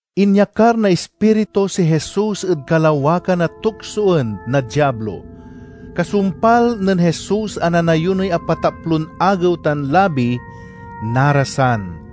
Inyakar na Ispiritu si Jesus ed kalawakan a tuksoen na Diablo. Kasumpal nen Jesus a nanayunoy apataplon agew tan labi, narasan.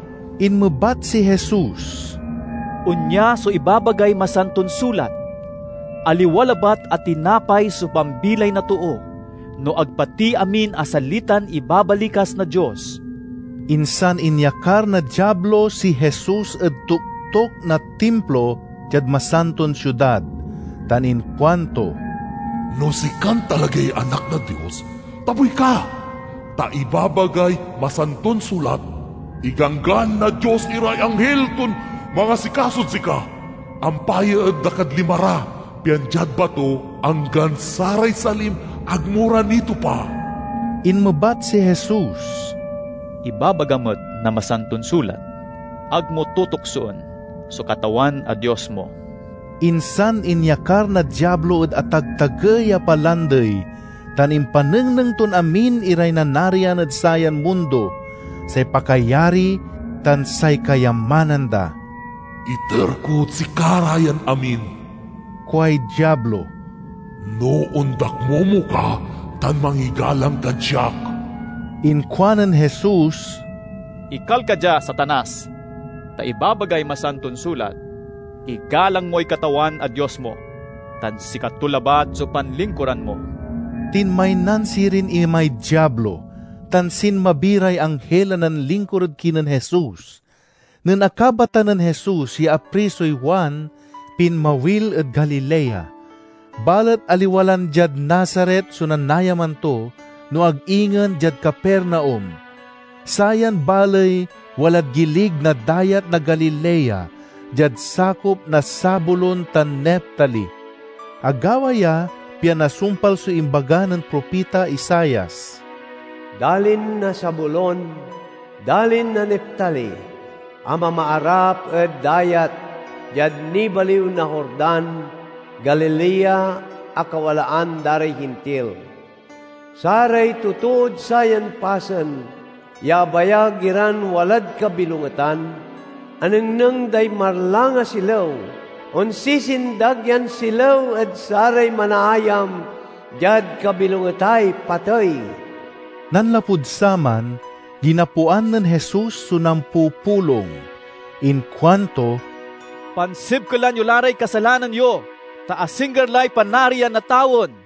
Inmebat si Jesus, "Onya so ibabagay Masanton Sulat: 'Aliwa labat a tinapay so pambilay na too, no ag pati amin a salitan ibabalikas na Dios.'" Insan inyakar na Diablo si Jesus ed toktok na Timplo diad Masanton Siudad, tan inkuanto, "No sikan talagay Anak na Dios, tabuy ka! Ta ibabagay Masanton Sulat: 'Iganggan na Dios iray anghil ton mangasikasod sika; ampayaen da kad lima ra, pian diad bato anggan saray salim ag mo ra nitopa.'" Inmebat si Jesus, "Ibabaga met na Masanton Sulat: 'Ag mo tutuksoen so Katawan a Dios mo.'" Insan inyakar na Diablo ed atagtagey a palandey, tan impanengneng ton amin iray nanarian ed sayan mundo, say pakayari tan say kayamanan da. "Iter kod sika ra yan amin," kuay Diablo. "no ondakmomo ka tan mangigalang kad siak." Inkuanen Jesus, "Ekal ka dia, Satanas! Ta ibabagay Masanton Sulat: 'Igalang moy Katawan a Dios mo, tan sikato labat so panlingkuran mo!'" Tinmaynan sirin imay Diablo, tan sinmabi ray anghil a nanlingkur ed kinen Jesus. Nen akabatan nen Jesus ya aprisoy Juan, pinmawil ed Galilea. Balet aliwa lan diad Nazaret so nanayaman to, no ag ingen diad Capernaum. Sayan baley walad gilig na Dayat na Galilea, diad sakop na Zabulon tan Neftali. Agawa ya pian nasumpal so imbaga nen propita Isaias: "Dalin na Zabulon, dalin na Neftali, a mamaarap ed dayat, diad nibaliw na Jordan, Galilea a kawalaan da ray Hintil! Saray totood sayan pasen ya abayag iran walad kabilongetan, anengneng day marlang a silew! Onsisindag yan silew ed saray manaayam diad kabilongetay patey!" Nanlapud saman, ginapoan nen Jesus so nampupulong. Inkuanto, "Pansibkelan yo la ray kasalanan yo, ta asingger lay Panarian na tawen!"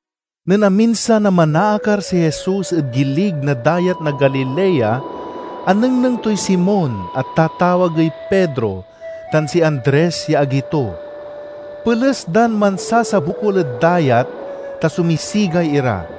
Nen aminsan a manaakar si Jesus ed gilig na Dayat na Galilea, anengneng toy Simon, a tatawagey Pedro, tan si Andres ya agi to. Peles dan mansasabokul ed dayat, ta sumisigay ira.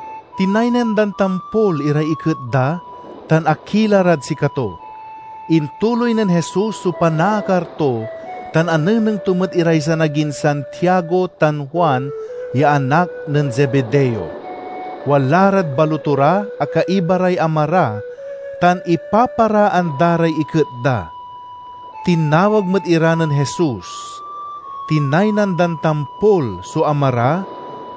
Tinaynan dan tampol iray iket da, tan akila rad sikato. Intuloy nen Jesus so panaakar to, tan anengneng to met iray sanagin Santiago tan Juan ya anak nen Zebedeo. Wala rad baloto ra a kaiba ray ama ra, tan ipaparaan da ray iket da. Tinawag met ira nen Jesus. Tinaynan dan tampol so ama ra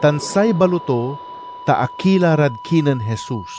tan say baloto, ta akila rad kinen Jesus.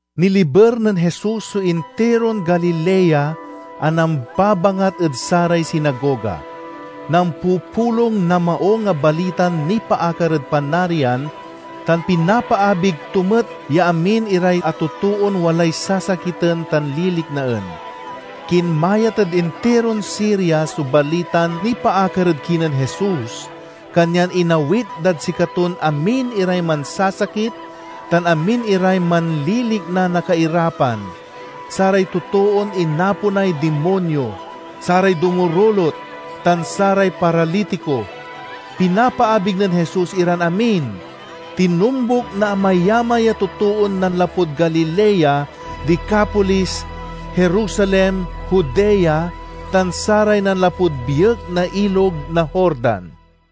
Niliber nen Jesus so intiron Galilea a nambabangat ed saray sinagoga. Nampupulong na Maung a Balitan nipaakar ed Panarian, tan pinapaabig to met ya amin iray a totoon walay sasakiten tan liliknaen. Kinmayat ed intiron Siria so balitan nipaakar ed kinen Jesus, kanyan inaawit dad sikaton amin iray mansasakit tan amin iray manlilikna na kairapan: saray totoon inaponay dimonyo, saray dumurulot, tan saray paralitiko. Pinapaabig nen Jesus iran amin. Tinombuk na amayamay a totoon nanlapud Galilea, Decapolis, Jerusalem, Judea, tan saray nanlapud biek na Ilog na Jordan.